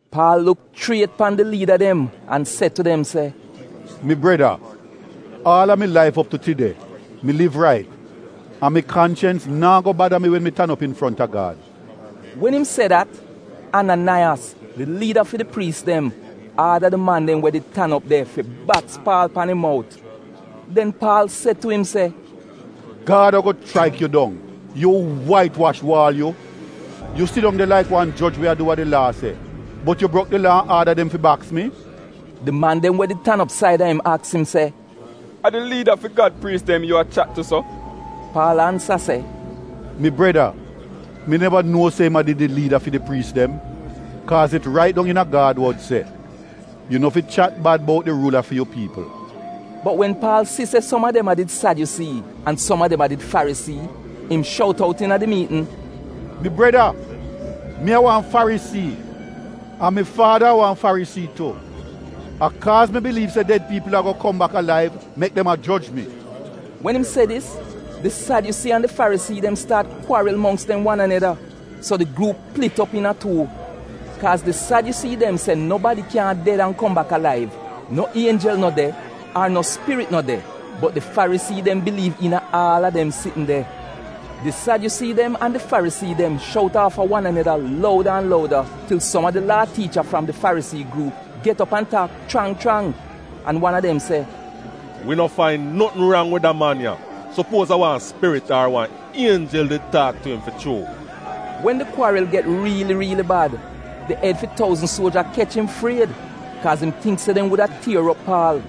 Paal luk chriet pan di liida dem an se tu dem se, “Mi breda, aal a mi laif op tu tide, mi liv rait, an mi kanchens naa go bada mi wen mi tan op infronta Gad. Wen im se dat, Ananaiyas, di liida fi di priis dem, aada di man dem we did tan op de fi baks Paal pan im mout. Den Paal se tu im se, “Gad ago chraik yu dong, yu wait wash waal yu! Yu sidong de laik wan joj we a du wa di Laa se, bot yu brok di Laa an aada dem fi baks mi?” Di man dem we did tan op saida im aks im se, “A di liida fi Gad priis dem yu a chat tu so?” Paal ansa se, “Mi breda, mi neva nuo se im a did di liida fi di priis dem, kaaz it rait dong iina Gad wod se, ‘Yu no fi chat bad bout di ruula fi yu piipl.’” Bot wen Paal si se som a dem a did Sadyusii an som a dem a did Farisii, im shout out iina di miitn, “Mi Breda, mi a wan Farisii, an mi faada a wan Farisii tu. A kaaz mi biliiv se ded piipl ago kom bak alaiv mek dem a joj mi.” Wen im se dis, di Sadyusii an di Farisii dem staat kwaril mongks dem wan aneda so di gruup plit op iina tuu. Kaaz di Sadyusii dem se nobadi kyaahn ded an kom bak alaiv, no ienjel no de, ar no spirit no de, bot di Farisii dem biliiv iina aal a dem sitn de. Di Sadyusii dem an di Farisii dem shout aafa wan aneda louda an louda til som a di Laa tiicha fram di Farisii gruup get op an taak chrang chrang, an wan a dem se, “Wi no fain notn rang wid da man ya. Sopuoz a wan spirit ar wan ienjel did taak tu im fi chuu?” Wen di kwaril get riili riili bad, di ed fi touzn suoja kech im fried kaaz im tingk se dem wuda tier op Paal.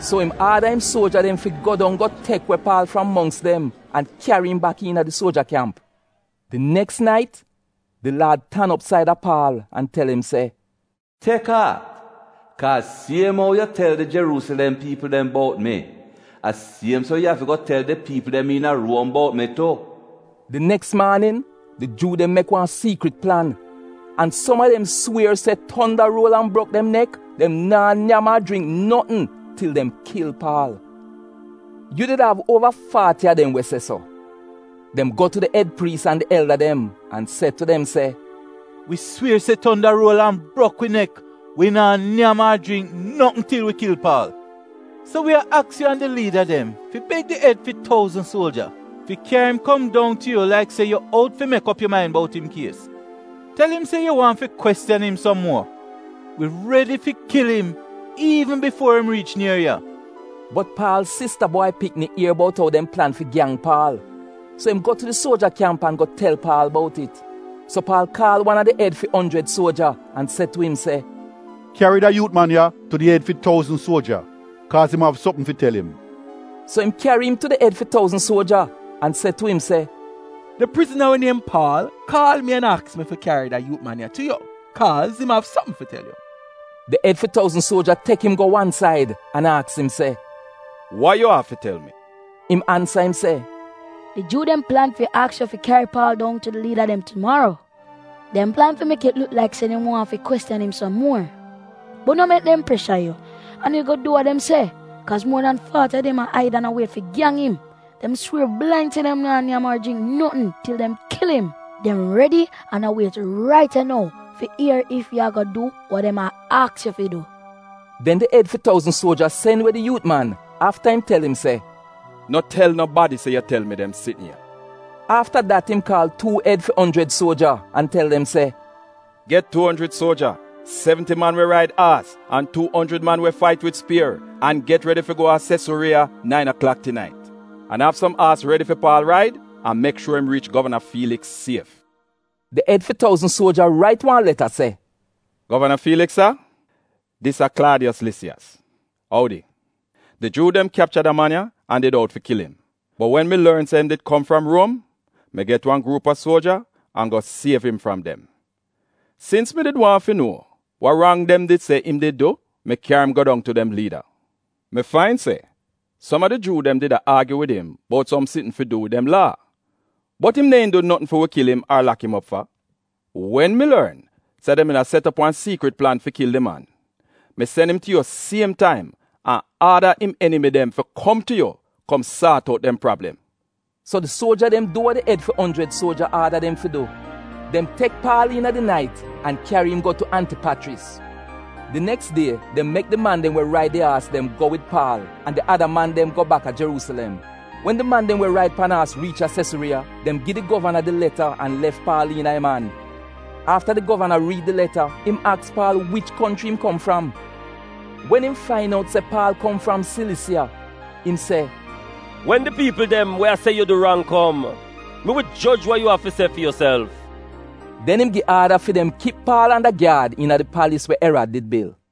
So im aada im suoja dem fi go dong go tek we Paal fram mongks dem an kyari im bak iina di suoja kyamp. Di neks nait di Laad tan op saida Paal an tel im se, “Tek aat, kaaz siem ou yu tel di Jeruusilem piipl dem bout mi, a siem so yu afi go tel di piipl dem iina Ruom bout mi tu.” Di neks maanin, di Juu dem mek wan siikrit plan an som a dem swier se tonda ruol an brok dem nek dem naa nyam ar jringk notn til dem kil Paal. Yu did av uova faati a dem we se so. Dem go tu di ed priis an di elda dem an se tu dem se, “Wi swier se tonda ruol an brok wi nek wi naa nyam ar jringk notn til wi kil Paal. So wi a aks yu an di liida dem fi beg di ed fi touzn suoja fi kyari im kom dong tu yu laik se yu out fi mek op yu main bout im kies. Tel im se yu waahn fi kwestiyan im som muor. Wi redi fi kil im iivn bifuo im riich nier ya.” Bot Paal sista bwai pikni ier bout ou dem plan fi gyang Paal, so im go tu di suoja kyamp an go tel Paal bout it. So Paal kaal wan a di ed fi onjrid suoja an se tu im se, “Kyari da yuut man ya tu di ed fi touzn suoja, kaaz im av sopm fi tel im.” So im kyari im tu ed fi touzn suoja an se tu im se, “Di prizna we niem Paal kaal mi an aks mi fi kyari da yuut man ya tu yu kaaz im av sopm fi tel yu.” Di ed fi touzn suoja tek im go wan said an aks im se, “Wa yu av fi tel mi?” Im ansa im se, “Di Juu dem plan fi aks yu fi kyari Paal dong tu di liida dem tumaro. Dem plan fi mek it luk laik se dem waahn fi kwestiyan im som muor. Bot no mek dem presha yu an yu go du wa dem se, kaaz muor dan faati a dem a aid an a wiet fi gyang im. Dem swier blain se dem naa nyam ar jringk notn til dem kil im. Dem redi an a wiet rait ya nou fi ier ef yu ago du wa dem a aks yu fi du.” Den di ed fi touzn suoja sen we di yuut man afta im tel im se, “No tel nobadi se yu tel dem sitn ya.” Afta dat im kaal tuu ed fi onjrid suoja an tel dem se, “Get tuu onjrid suoja, sevnti man we raid aas an tuu onjrid man we fait wid spier an get redi fi go a Sesuriiya nain aklak tinait. An av som aas redi fi Paal raid an mek shuor se im riich govana Fiiliks sief.” Di ed fi touzn suoja rait wan leta se: Govana Fiiliks sa, dis a Klaadiyos Lisiyas. Oudi! Di Juu dem kyapcha da man ya an did out fi kil im. Bot wen mi lorn se im did kom fram Ruom, mi get wan gruup a suoja an go siev im fram dem. Sins mi did waahn fi nuo wa rang dem did se im did du, mi kyari im go dong tu dem liida. Mi fain se som a di Juu dem did a aagyu wid im bout som sitn fi du wid dem Laa, bot im neehn du notn fi wi kil im ar lak im op fa. Wen mi lorn se dem did a set op wan siikrit plan fi kil di man, mi sen im tu yu siem taim an aada im enimi dem fi kom tu yu kom saat out dem prablem. So di suoja dem du we di ed fi onjrid suoja aada dem fi du. Dem tek Paal iina di nait an kyari im go tu Antipachris. Di neks die dem mek di man dem we raid di aas dem go wid Paal an di ada man dem go bak a Jeruusilem. Wen di man dem we raid pan aas riich a Sesuriiya, dem gi di govana di leta an lef Paal iina im an. Afta di govana riid di leta, im aks Paal wich konchri yu kom fram. Wen im fain out se Paal kom fram Silisiya, im se, “Wen di piipl dem we a se yu du rang kom mi wi joj wa yu av fi se fi yuself.” Den im gi aada fi dem kip Paal anda gyaad iina di palis we Erad did bil.